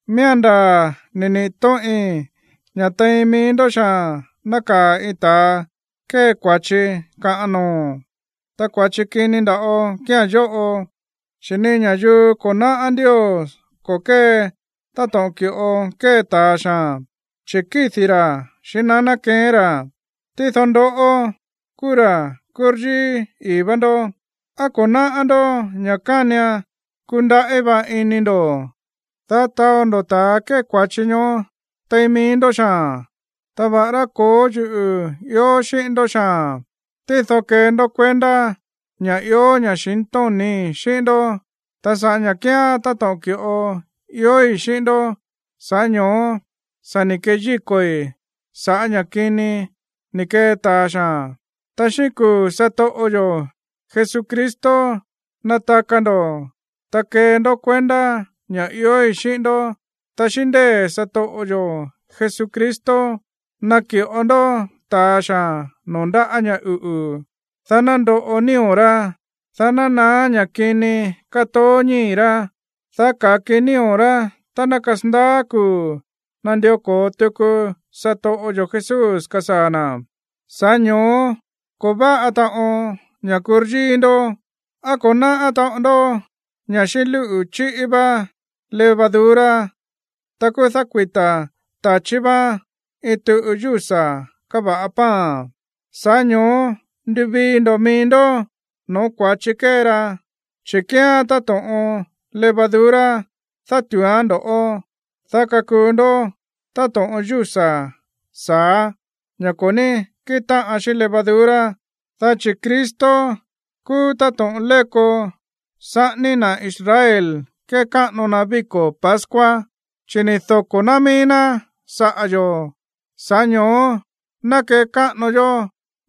Miía̱n ndaa̱ ni̱ niꞌi̱ tóꞌin ña̱ tein mií ndó xaa̱n nákaa̱ iin ta̱a kée kua̱chi kaꞌan noo̱. Ta kua̱chi kini nda̱ꞌo kía̱n yóꞌo, chi̱ ni ña̱yuu ko̱ náꞌá Ndios ko̱ kée táto̱ꞌon ki̱ꞌo kée ta̱a xaa̱n, chi̱ kídi̱ ra̱ xíꞌín naná keꞌén ra̱. Tído ndoꞌó kúú ra̱ kúryíí ii̱ vá ndó. ¿Á ko̱ náꞌá ndó ña̱ kánian kundaꞌí va ini ndo̱, dá taó ndo̱ ta̱ kée kua̱chi ñoó tein mií ndó xaa̱n? Ta va̱ꞌará ko̱ó yuꞌu̱ ió xíꞌín ndó xaa̱n, tído kee ndó kuendá ña̱ ió ña̱xintóni̱í xíꞌín ndó. Ta sa̱ꞌá ña̱ kíán táto̱ꞌon ki̱ꞌo iói̱ xíꞌín ndó, sa̱ꞌá ño̱ó sa̱ ni̱ keyíko̱i̱ sa̱ꞌá ña̱ kini ni̱ kee ta̱a xaa̱n. Ta xíꞌín kuu̱ satoꞌo yo̱ Jesucristo nataka ndo̱, ta kee ndó kuendá ña̱ iói̱ xíꞌín ndó, ta xíꞌín ndée̱ satoꞌo yo̱ Jesucristo naki̱ꞌo ndó ta̱a xaa̱n noo̱ ndáꞌa̱ ña̱ uꞌu̱, dá ná ndoꞌo nío̱ rá, dá ná naá ña̱ kini kátoó ñíi̱ rá, dá ka̱ki nío̱ rá tá ná kasandaá kuu̱ nandió ko̱o tuku satoꞌo yo̱ Jesús kasaa̱ na̱. Sa̱ꞌá ño̱ó ko̱ váꞌa taꞌon ña̱ kúryíí ndó. ¿Á ko̱ náꞌá taꞌon ndó ña̱ xíꞌín lúꞌu̱ chíꞌí vá levadura, ta kúú dákuita̱ ta̱chí vaan iin tuꞌu yúsa̱ káva̱ꞌa pan? Sa̱ꞌá ño̱ó nduvii ndo̱ mií ndó no̱ó kua̱chi kée ra, chi̱ kíán táto̱ꞌon levadura dátu̱úán ndo̱ꞌó, dá kakuu ndó táto̱ꞌon yúsa̱ sa̱á, ña̱ ko̱ ní kíꞌin táꞌan xíꞌín levadura. Dá chi̱ Cristo kúú táto̱ꞌon léko saꞌání na̱ Israel kékáꞌano na víko̱ pascua, chi̱ ni̱ doko̱ ná mií ná saꞌa̱ yo̱. Sa̱ꞌá ño̱ó ná kekáꞌano yó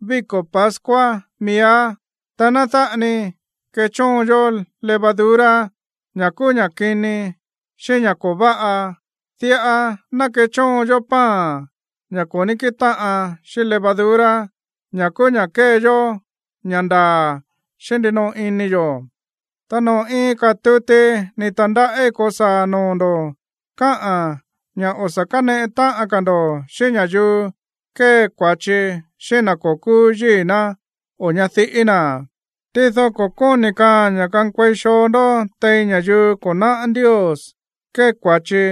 víko̱ pascua miíá, ta ná dáꞌa ni kechóon yó levadura, ña̱ kúú ña̱ kini xíꞌín ña̱ ko̱ váꞌa. Diꞌa ná kechóon yó pan, ña̱ ko̱ ní kíꞌin táꞌan xíꞌín levadura, ña̱ kúú ña̱ kée yó ña̱ ndaa̱ xíꞌín ndinoꞌo ini yo̱. Ta noo̱ iin ka̱ tuti ni̱ ta̱ndaꞌí ko̱saa̱ noo̱ ndo̱ káꞌa̱n ña̱ o̱ sa̱ káneꞌe táꞌan ka̱ ndo̱ xíꞌín ña̱yuu kée kua̱chi xíꞌín na̱ ko̱ kúú yíi̱ ná o ñadiꞌí na̱. Tído ko̱ kóni̱ kaaa̱n ña̱ kankuei xoo ndó tein ña̱yuu ko̱ náꞌá Ndios kée kua̱chi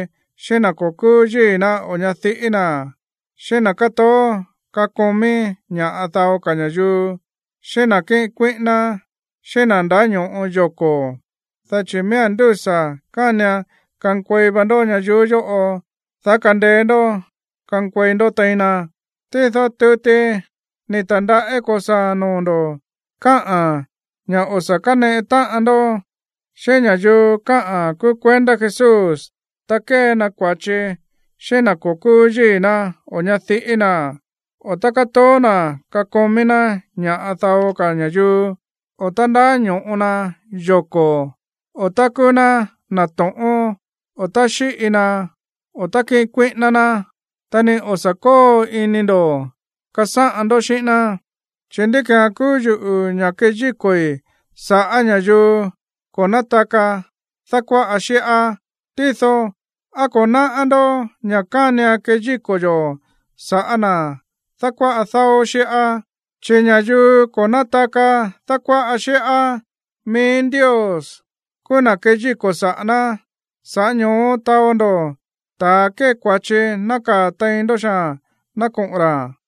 xíꞌín na̱ ko̱ kúú yíi̱ ná o ñadiꞌí na̱, xíꞌín na̱ kátoó kakomí ña̱ꞌa dao ka̱ ña̱yuu, xíꞌín na̱ kíꞌin kuíꞌíná, xíꞌín na̱ ndáño̱ꞌo yoko̱. Dá chi̱ miía̱n ndúsa̱ kánian kankuei va ndó ñayuú yóꞌo, dá kandeé ndó kankuei ndó tein na. Tído tuti ni̱ ta̱ndaꞌí ko̱saa̱ noo̱ ndo̱ káꞌa̱n ña̱ o̱ sa̱ káneꞌe táꞌan ndó xíꞌín ña̱yuu káꞌa̱n kúú kuendá Jesús tá kée na kua̱chi xíꞌín na̱ ko̱ kúú yíi̱ ná o ñadiꞌí na̱, o tá kátoó na̱ kakomí ná ña̱ꞌa dao ka̱ ña̱yuu, o tá ndáño̱ꞌo na yoko̱, o tá kúú ná na̱ to̱ꞌón, o tá xíꞌi na, o tá kíꞌin kuíꞌíná ná. Ta ni o̱ sa̱ kóo ini ndo̱ kasáꞌan ndó xíꞌín ná. Chi̱, ¿ndí ki̱án kúú yuꞌu̱ ña̱ keyíko̱i̱ sa̱ꞌá ña̱yuu ko̱ nátaka dákuáꞌa xíꞌá? Tído, ¿á ko̱ náꞌá ndó ña̱ kánian keyíko̱ yo̱ sa̱ꞌá na̱ dákuáꞌa dáó xíꞌá? Chi̱ ña̱yuu ko̱ nátaka dákuáꞌa xíꞌá, mií Ndios kúú na̱ keyíko̱ saꞌa̱ ná. Sa̱ꞌá ño̱ó taó ndo̱ ta̱a kée kua̱chi nákaa̱ tein ndó xaa̱n ná koꞌo̱n ra̱.